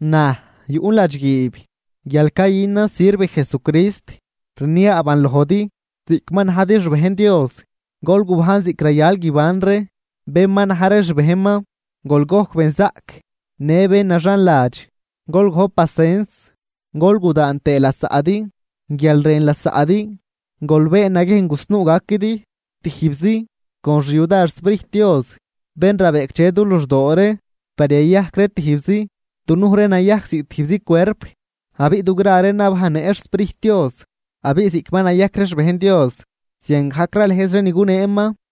Naj, yuꞌn ladxguiib guial cayünan sirv Jesucrist, rniaaban lojdi ziꞌc ma najdi xbejn Dios, gol gubajn ziꞌc rayal guiban ree bén ma na̱j ree xbejnman. Gol gojc benzaꞌc në bén naxanladx, gol gojp pacens gol gudaan tëë lasaꞌdi guial rën lasaꞌdi. Gol been naguiejn gusnuu gaquidi tijbzi con xyudar xSprijt Dios bén rabeꞌcdxe du luxdoo ree par yayajc ree tijbzi. Dunuj ree nayajc ziꞌc tijbzi cuerp, abiꞌ dugra ree nabajnnëꞌ xSprijt Dios, abiꞌ ziꞌc ma nayajc ree xbejn Dios, ziangajc ralëjz ree ni guneeman.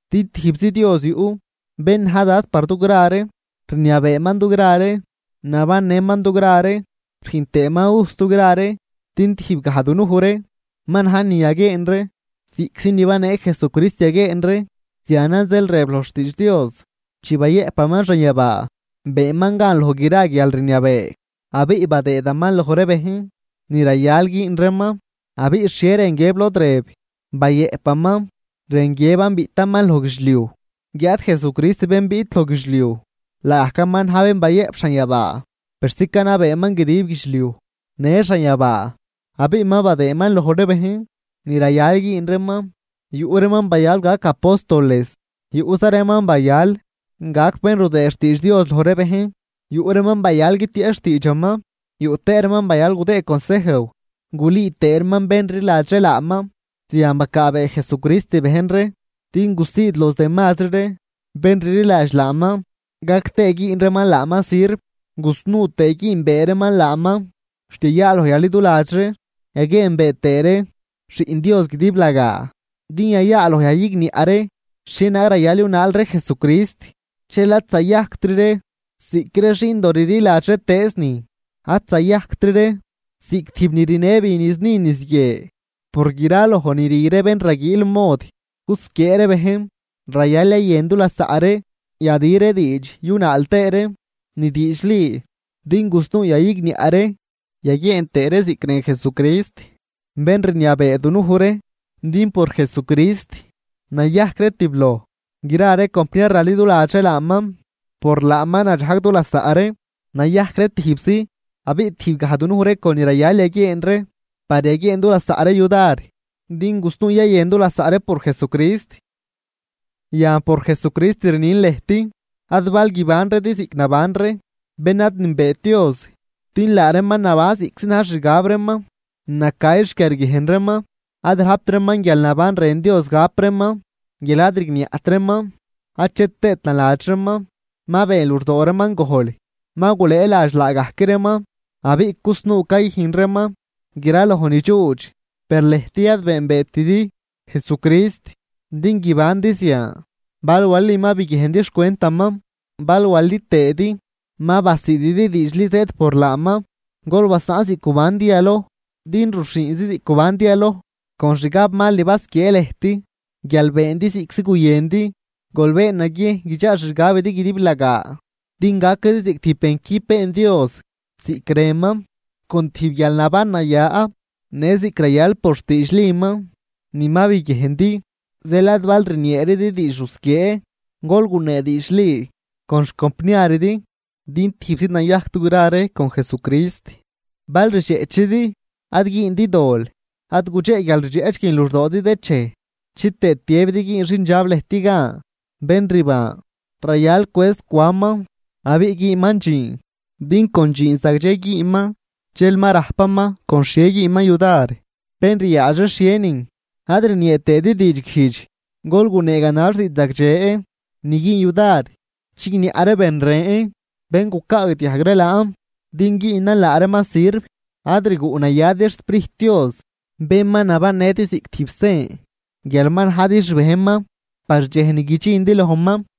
Din tijbzi Dios yuꞌ, bén na̱j Dad par dugra ree, rniabeeman dugra ree, nabannëman dugra ree rüjn tëëman ujs dugra ree. Per tijb gaj dunuj ree ma na̱j ni yaguieen ree, ziꞌctzi ni banee Jesucrist yaguieen ree. Zianan zeel rëb loj xtiidx Dios: Chi bayëꞌpaman xanyabaa, beenman gan loj gra guialrniabee, abiꞌ badëëdaman loj ree bejn ni rayal güün reeman. Abiꞌ, ¿xhie rën guiëb lod rëb “bayëꞌpaman”? Rën guiëban biꞌtaman loj guidxliuj. Guiáad Jesucrist bén biꞌt loj guidxliuj, laagajcaman na̱j bén bayëꞌp xanyabaa persi canabeeman guidib guidxliuj në xanyabaa. Abiꞌ ma badëëman loj ree bejn ni rayal güün reeman, yuꞌ reeman bayal gac apóstoles, yuꞌza reeman bayal gac bén rudëë xtiidx Dios loj ree bejn, yuꞌ reeman bayal guitieꞌch xtiidxaman, yuꞌ tëë reeman bayal gudëë consejw gulüü tëë reeman bén rliladx ree laaman. Zian bacaabee Jesucrist bejn ree din gusiid los demazri ree bén rliladx laaman, gac tëë güün reeman laaman sirv, gusnuu tëë güünbee reeman laaman, xt yayaaloj yaliduladx ree yaguieenbee tëë ree Xiꞌn Dios guidiblagaa, din yayaaloj yayigniaꞌ ree xhienaag rayal yunaal ree Jesucrist. Dxel ad zayajctri ree ziꞌc ree xindoo rliladx xhietëëznin, ad zayajctri ree ziꞌc tijb ni rnë bi niz ni niz guie por graloj ni rü ree bén raguiil mod gusquiee ree bejn, rayal yayën du lasaꞌ ree, yadü ree diidx yunaal tëë ree ni diidxli din gusnuu yayigniaꞌ ree yaguieen tëë ree ziꞌc rën Jesucrist bén rniabee dunuj ree. Din por Jesucrist nayajc ree tibloj gra ree compniar raliduladx ree laaman. Por laaman nadxajg dulasaꞌ ree nayajc ree tijbzi, abiꞌ tijb gaj dunuj ree con ni rayal yaguieen ree par yaguieen du lasaꞌ ree yudar din gusnuu yayën dulasaꞌ ree por Jesucrist. Yan por Jesucrist rnin lëjt: Ad bal guibanridi ziꞌc naban ree ben ad nünbeet Dios, din laa reeman naban ziꞌctzi na̱j xixgab reeman, nacay xquiarguiejn reeman, ad rajpt reeman guialnaban rën Dios gap reeman, guial ad rigniaꞌt reeman ache tëët naladx reeman. Ma been luxdoo reeman gojl, ma gulëëladx laagajc reeman abiꞌ cusnuu cayüjn reeman graloj nidxuudx. Per lëjt ad beenbeetidi Jesucrist din guibandi zian, bal walidi ma biguiejndi xcwentaman bal wali tëëdi ma basiididi diidxli zëëd por laaman. Gol basaꞌn ziꞌc gubandi yaloj, din ruxhiinzi ziꞌc gubandi yaloj con xgabmal ni basquiee lëjt guial beendi ziꞌctzi guyëndi. Gol been naguiejn guidxaa xixgabidi guidiblagaa din gaquidi ziꞌc tijb bencüb been Dios ziꞌc rënman, con tijb guialnaban naya në ziꞌc rayal por xdiidxliman ni ma biguiejndi. Zeel ad bal rnieeridi diidx rusquiee. Gol gunee diidxli con xcompniaridi din tijbzi nayajc dugra ree con Jesucrist. Bal rdxeꞌchidi, ad güündi dol. Ad gudxeꞌ guialrdxeꞌch guin luxdoodi dëchej, chitëë tiëbidi güün xindxab lëjt gan. Bén rban, rayal gucwëëz cwanman abiꞌ güünman dxiin, din con dxiin zagdxe güünman dxel ma rajpaman con xhie güünman yudar bén ryaadx ree xhienin. Ad rniee tëëdi diidxguijdx, gol gunee ganax diidxzagdxe ni güün yudar chigniaꞌ ree ben ren bén gucaagdiajg ree laan din güünan laa reeman sirv. Ad rguꞌnayadi xSprijt Dios, bén ma nabannëdi ziꞌc tijb sen guial ma najdi xbejnman par dxej ni guidxindi lojman.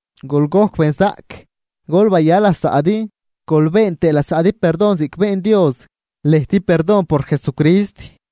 Gol gojc benzaꞌc, gol baya lasaꞌdi gol been tëë lasaꞌdi perdon ziꞌc been Dios lëjt perdon por Jesucrist.